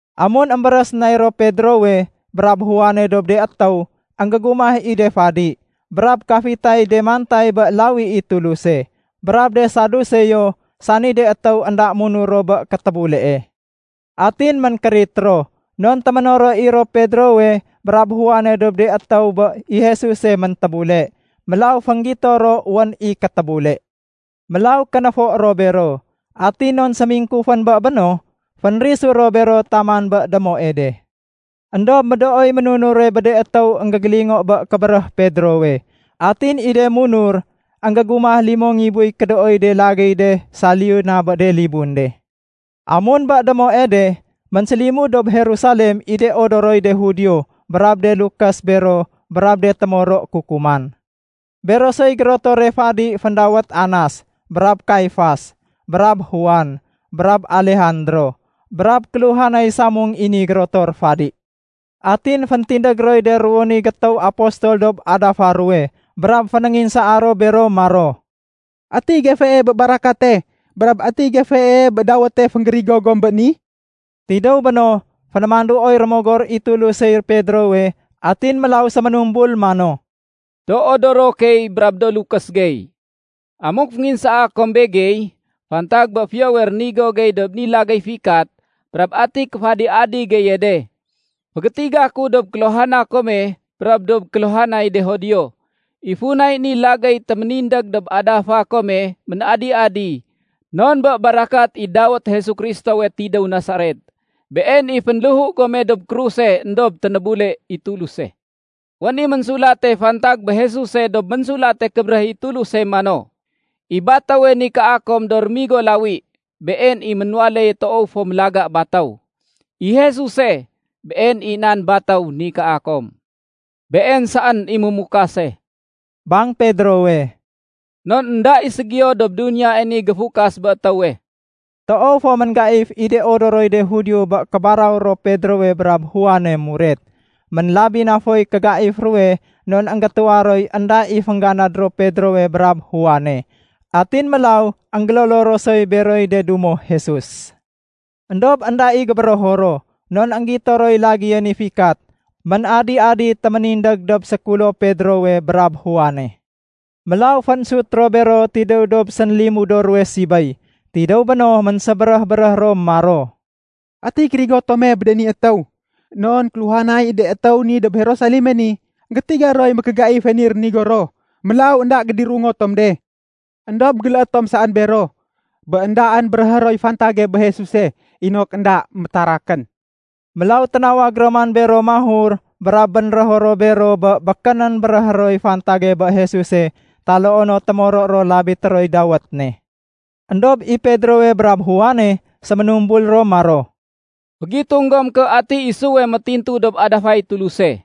Amun émbéréh sénay ro Pedrowe brab Juane dob de étéw, énggégumah i de fadi, brab kafitay de mantay bé lawi i Tuluse, brab de Saduseo sani de étéw énda munur ro bé kétébulee. Atin ménkérit ro non téménoro i ro Pedrowe brab Juane dob de étéw bé i Jesuse méntébule. Mélaw fénggito ro wén i kétébule. Mélaw kénéfo ro bero, atin non sémingkufén bé béno, fénrisu ro bero taman bé démoe de. Endob médooy ménunure bé de étéw énggégélingo bé kébéréh Pedrowe, atin i de munur énggégumah limo ngibuy kédooy de lagéy de saliyu na bé de libun de. Amun bé démoe de, ménsélimud dob Jerusalem i de odoroy de Judio brab de lukés bero brab de témoro kukuman. Bero soy gérotore fadi féndawét Anas, brab Kaifas, brab Juan, brab Alejandro brab kéluhanay samung i ni gérotor fadi. Atin féntindég roy de ruwo ni gétéw apostol dob adafa ruwe brab fénénginsaa ro bero maro, “Ati gefee bé barakate brab ati gefee bé dawéte fénggérigo gom bé ni?” Tidéw béno, fénémanduoy Rémogor i Tulusey Pedrowe atin mélaw séménumbul mano, “Do odoro key brab do lukés gey. Amuk fénginsaa kom begey fantag bé fiyowe rénigo gey dob ni lagéy fikat brab ati kéféadi-adi geye de, fégétiga ku dob kéluhana kome brab dob kéluhanay de Judio. I funay ni lagéy téménindég dob adafa kome ménadi-adi, non bé barakat i dawét Jesu Kristowe tidéw Nasaret. Been i fénléhu gome dob kruse éndob ténébule i Tuluse. Wén i ménsulate fantag bé Jesuse dob Ménsulate Kébéréh i Tuluse mano, ‘I batéwe nikaa kom do rémigo lawi, been i ménwaléye toow fo mélaga batéw.’ I Jesuse, Been i nan batéw nikaa kom. Been saén i Mémukase,” bang Pedrowe, “non énda i ségiyo dob duniyae ni géfukas bé étéwe.” Toow fo ménggaif i de odoroy de Judio bé kébaraw ro Pedrowe brab Juane muret. Ménlabi na foy kégaif ruwe non énggétuwa roy énda i féngganad ro Pedrowe brab Juane. Atin mélaw énggélolo ro soy beroy de dumo Jesus. Endob énda i gébérého ro, non énggito roy lagéye ni fikat ménadi-adi téménindég dob sékulo Pedrowe brab Juane. Mélaw fénsut ro bero tidéw dob sénlimudo ruwe sibéy. Tidéw béno ménsébéréh-béréh ro maro, “Ati kérigo tome bé de ni étéw? Non kéluhanay de étéw ni dob Jerusaleme ni, énggétiga roy mékégaife ni rénigo ro. Mélaw énda gédirungo tom de. Endob géléé tom saén bero bé éndaén béréhé roy fantage bé Jesuse inok énda métarakén.” Mélaw ténawag ro man bero mahur brab bénrého ro bero bé békénén béréhé roy fantage bé Jesuse taloo no témoro ro labité roy dawét ne. Endob i Pedrowe brab Juane séménumbul ro maro, “Fégitung gom ké ati isuwe métintu dob adafay Tuluse,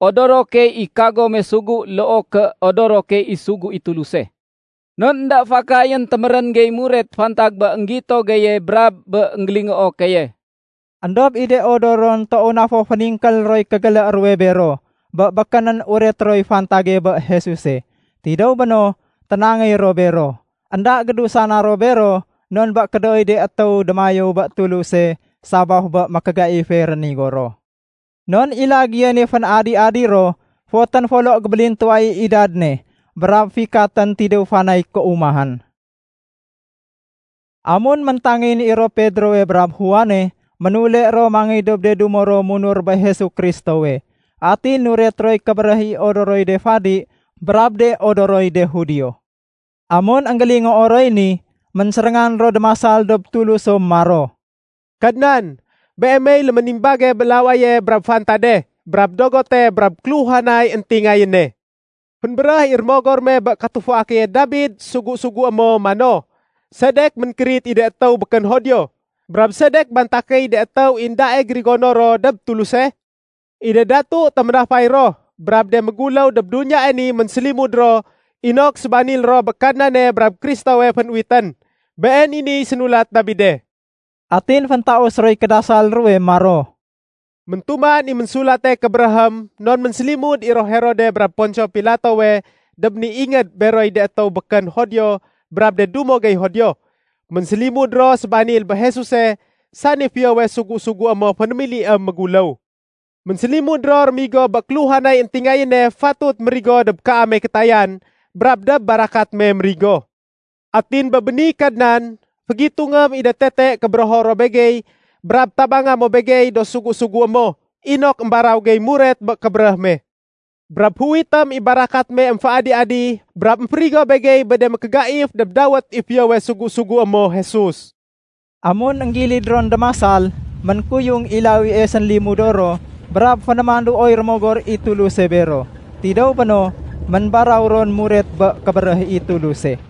odoro key i kagome sugu loo ké odoro key i sugu i Tuluse. Non énda fakayén témérén gey muret fantag bé énggito geye brab bé énggélingoo keye.” Endob i de odoron toow na fo féningkél roy kégélé ruwe bero bé békénén ureté roy fantage bé Jesuse. Tidéw béno, ténangéy ro bero. Enda gédusana ro bero non bé kédooy de étéw démayéw bé Tuluse sabaf bé mékégaife rénigo ro. Non i lagéye ni fén-adi-adi ro fotén folo gébélintuwa i idad ne, brab fikatén tidéw fanay kéumahén. Amun méntangéyén i ro Pedrowe brab Juane, ménule ro mangéy dob de dumo ro munur bé Jesu Kristowe. Atin nuret roy kébéréh i odoroy de fadi brab de odoroy de Judio. Amun énggélingoo roy ni, ménséréngan ro démasal dob Tuluso maro, “Kadnan, Beemey léménimbage bé lawaye brab fantade brab dogote brab kéluhanay éntingayéne. Fénbéréh i Rémogor me bé katufua keye Dabid sugu-sugué mo mano, ‘Sedek ménkérit i de étéw békén Judio? Brab sedek bantakéy de étéw i éndae gérigono ro dob Tuluse? I de datu téménafay ro brab de méguléw dob duniyae ni ménsélimud ro inok sébanil ro bé Kadnane brab Kristowe fénuwitén.’ Been i niy sénulat Dabide.” Atin féntaus roy kédasal ruwe maro, “Méntuman i Ménsulate Kébéréhém non ménsélimud i ro Herode brab Ponsio Pilatowe dob ni ingéd beroy de étéw békén Judio brab de dumo gey Judio. Ménsélimud ro sébanil bé Jesuse sani fiyowe sugu-sugué mo fénémiliém méguléw. Ménsélimud ro rémigo bé kéluhanay éntingayéne fatut mérigo dob kaame kétayan brab dob barakat me mérigo. Atin bé béni Kadnan, fégitungém i de tete kébérého ro begey brab tabanga mo begey do sugu-sugué mo inok émbaraw gey muret bé kébéréh me. Brab féuwitém i barakat me émféadi-adi brab émférigo begey bé de mékégaif dob dawét i fiyowe sugu-sugué mo Jesus.” Amun énggilid ron démasal, ménkuyung i lawie sénlimudo ro brab fénémanduoy Rémogor i Tuluse bero. Tidéw béno, ménbaraw ron muret bé kébéréh i Tuluse.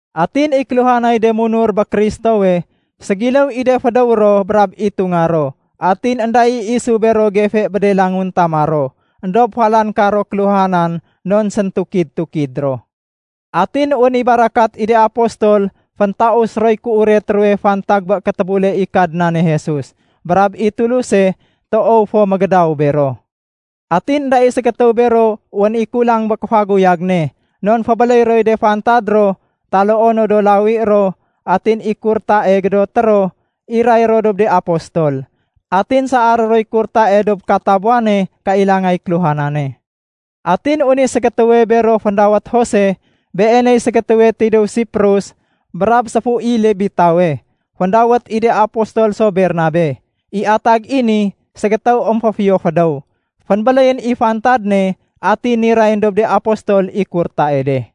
Atin i kéluhanay de munur bé Kristowe, ségiléw i de fédéw ro brab itunga ro. Atin énda i isu bero gefe bé de languntama ro, éndob falan karo kéluhanan non séntukid-tukid ro. Atin wén i barakat i de apostol féntaus roy kéuret ruwe fantag bé kétébule i Kadnane Jesus. Brab i Tuluse toow fo mégédaw bero. Atin énda i ségétéw bero wén i kulang bé kéfaguyag ne non fébéléy roy de fantad ro taloo no do lawi ro atin i kurtae gédoté ro, iray ro dob de apostol. Atin saaré roy kurtae dob katabuwane kailangay kéluhanane. Atin wén i ségétéwe bero féndawét Jose. Beeney ségétéwe tidéw Siprus brab séfu i Lebitawe. Féndawét i de apostol so “Bernabe”. (I atag i ni “Ségétéw émféfiyo fédéw”.) Fénbéléyén i fantad ne atin nirayén dob de apostol i kurtae de.